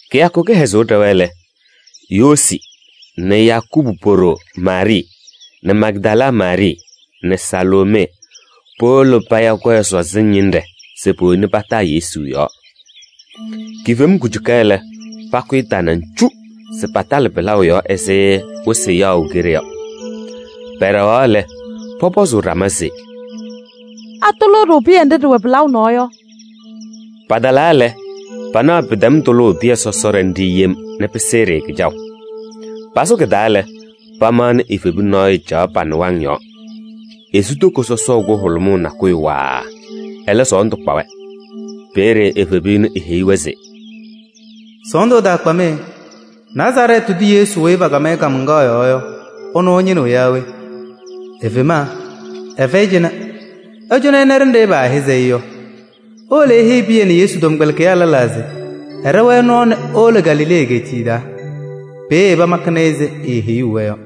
Kɩyakʋ kɩhɛzʋʋ ɖɛwa lɛ, Yoosi nɛ Yakubu po-ɖoo Maarɩɩ nɛ Magdala Maarɩɩ nɛ Saloomee powolo paya kɔyɛ sɔzɩŋ ñɩnɖɛ se powoni pataa Yesu yɔɔ. Kifem kujuka lɛ, pakʋyɩ tanaŋ cu se patalɩ pɩlaʋ yɔɔ ɛzɩ wɩsɩ yaɣʋ keɖe yɔ. Pɛɖɛɣaɣ lɛ, pɔpɔzʋʋ ɖama se: “Atʋlʋʋ-ɖʋ pɩyɛ nɖɩ ɖɩwɛ pɩlaʋ nɔɔ yɔ?” Patalaa lɛ, panaɣ pɩtɛm tʋlʋʋ pɩyɛ sɔsɔɖɛ nɖɩ yem nɛ pɩsɩɩ-ɖɩ kɩjaʋ. Pasʋ kɩ-taa lɛ, pamaɣnɩ evebu nɔɔyʋ caɣ pa-nɩwaŋ yɔɔ. Esu toko sɔsɔʋ kʋhʋlʋmʋʋ nakʋyʋ waaa, ɛlɛ sɔɔndʋ kpa-wɛ. Peeye evebu ɛnʋ eheyi-wɛ se: “Sɔɔndʋ ɛtaakpa-mɩ. Nazarɛɛtɩ tʋ Yesu weyi paakam kaamaŋkaɣ yɔɔ yɔ, ɛnʋ ɩñɩnɩɣ yaa we? Efema, ɛfɛyɩ cɩnɛ. Ɩcɔnɩ ɩna ɖenɖe paahɛzɩ-ɩ yɔ. Iwolo iheyi Pɩyɛ nɛ Yesu tɔmkpɛlɩkɩyaa lɛlaa se ɛɖɛ-wɛ nɔɔ nɛ ewolo Galilee egeetiye taa. Peeye pamakɩnɩ-ɩ ɛzɩ eeheyuu-wɛ yɔ.”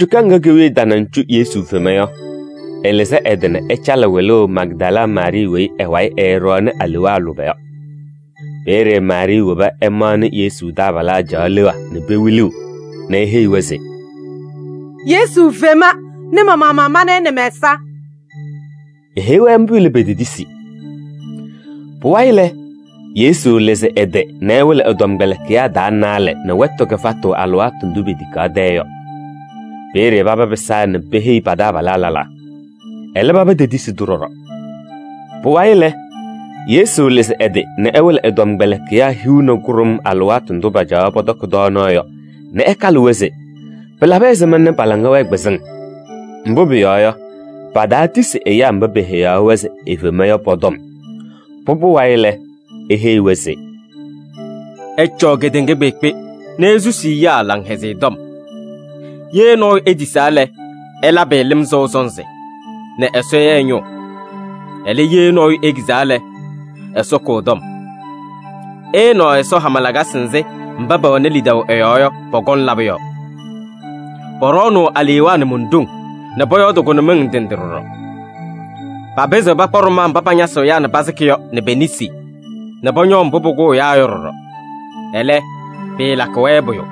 Kujuka ŋga ke-wiye tanaŋ cu Yesu fema yɔ, ɛlɩzɩ ɛ-tɩ nɛ ɛcalɩ wɩlʋʋ Magdala Maarɩɩ weyi ɛ-wayɩ ɛɛɖɔɔnɩ alewaa lʋbɛ yɔ. Peeye Maarɩɩ woba ɛmaɣnɩ Yesu taabalaa caɣ leɣa nɛ pewiliɣ nɛ eheyi-wɛ se: “Yesu fema nɛ ma-maɣmaɣ mana-ɩ nɛ mɛ-ɛza.” Eheyi-wɛ mbʋ lɛ, petetisi. Pʋwayɩ lɛ, Yesu lɩzɩ ɛ-tɩ nɛ ɛwɩlɩ ɛ-tɔmkpɛlɩkɩyaa taa naalɛ nɛ wɛtʋ kɩfatʋ alɩwaatʋ ndʋ petikaɣ tɛyɛ yɔ. Peeye paba pɩsaa nɛ peheyi pa-taabalaa lɛlaa. Ɛlɛ, paba tetisi-tʋ ɖɔɖɔ. Pʋwayɩ lɛ, Yesu lɩzɩ ɛ-tɩ nɛ ɛwɩlɩ ɛ-tɔmkpɛlɩkɩyaa hiu nɛ kʋɖʋm alɩwaatʋ ndʋ pacaɣaɣ pɔtɔkɩ tɔɔnaɣ yɔ nɛ ɛkalɩ-wɛ se pɩlabɩ ɛzɩma nɛ pa-laŋa wɛɛ kpɩzɩŋ. Mbʋ pʋyɔɔ yɔ, pataatisi ɛyaa mba peheyaɣ-wɛ se efema yɔ pɔ-tɔm. Pʋbʋ wayɩ lɛ, eheyi-wɛ se: “Ɩcɔɔ kedeŋa kpeekpe nɛ isusi ɛyaa Laŋhɛzɩyɛ Tɔm. Ye nɔɔyʋ etisaa lɛ, ɩlabɩ-ɩ lɩm sɔʋ sɔnzɩ nɛ Ɛsɔ ya ɛ-ñʋʋ. Ɛlɛ, ye nɔɔyʋ ekizaa lɛ, Ɛsɔ kʋ ɛ-tɔm. Ɩɩnaɣ Ɛsɔ hama lakasɩ nzɩ mba pɛwɛnɩ lidaʋ ɛ-yɔɔ yɔ, pɔkɔŋ labʋ yɔ: pɔɖɔɔnʋʋ alewaa nɛ mon-ɖoŋ nɛ pɔyɔɔdɩ kʋnʋmɩŋ ndɩ ndɩ ɖɔɖɔ. Papɩzɩɣ pakpa ɖʋmaa mba pañasɩɣ ɛyaa nɛ pasɩkɩ yɔ nɛ pe-nesi nɛ pɔñɔɔ mbʋ pʋkʋʋ ɛyaa yɔ ɖɔɖɔ, ɛlɛ, pɩɩlakɩ-wɛ pʋyʋ.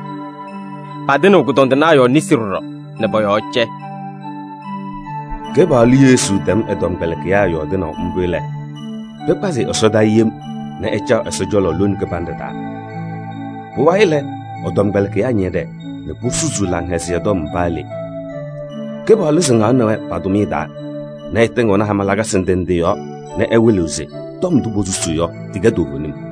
Patɩnɩɣ kʋdɔndɩnaa yɔɔ nesi ɖɔɖɔ nɛ pɔ-yɔɔ cɛ.” Kɩpaɣlʋ Yesu tɛm ɛ-tɔmkpɛlɩkɩyaa yɔɔdɩnaʋ mbʋ lɛ, pɩkpazɩ-ɩ ɛsɔdaa yem nɛ ɛcaɣ Ɛsɔ cɔlɔ lone kɩbanɖɛ taa. Pʋwayɩ lɛ, ɛ-tɔmkpɛlɩkɩyaa ñɛɖɛɛ nɛ posusuu Laŋhɛzɩyɛ Tɔm paa le. Kɩpaɣlʋ sɩŋaɣnɩ-wɛ pa-tʋmɩyɛ taa nɛ ɛtɩŋɩɣnɩ hama lakasɩ ndɩ ndɩ yɔɔ nɛ ɛwɩlɩɣ se tɔm ndʋ posusuu yɔ, tɩkɛ toovenim.]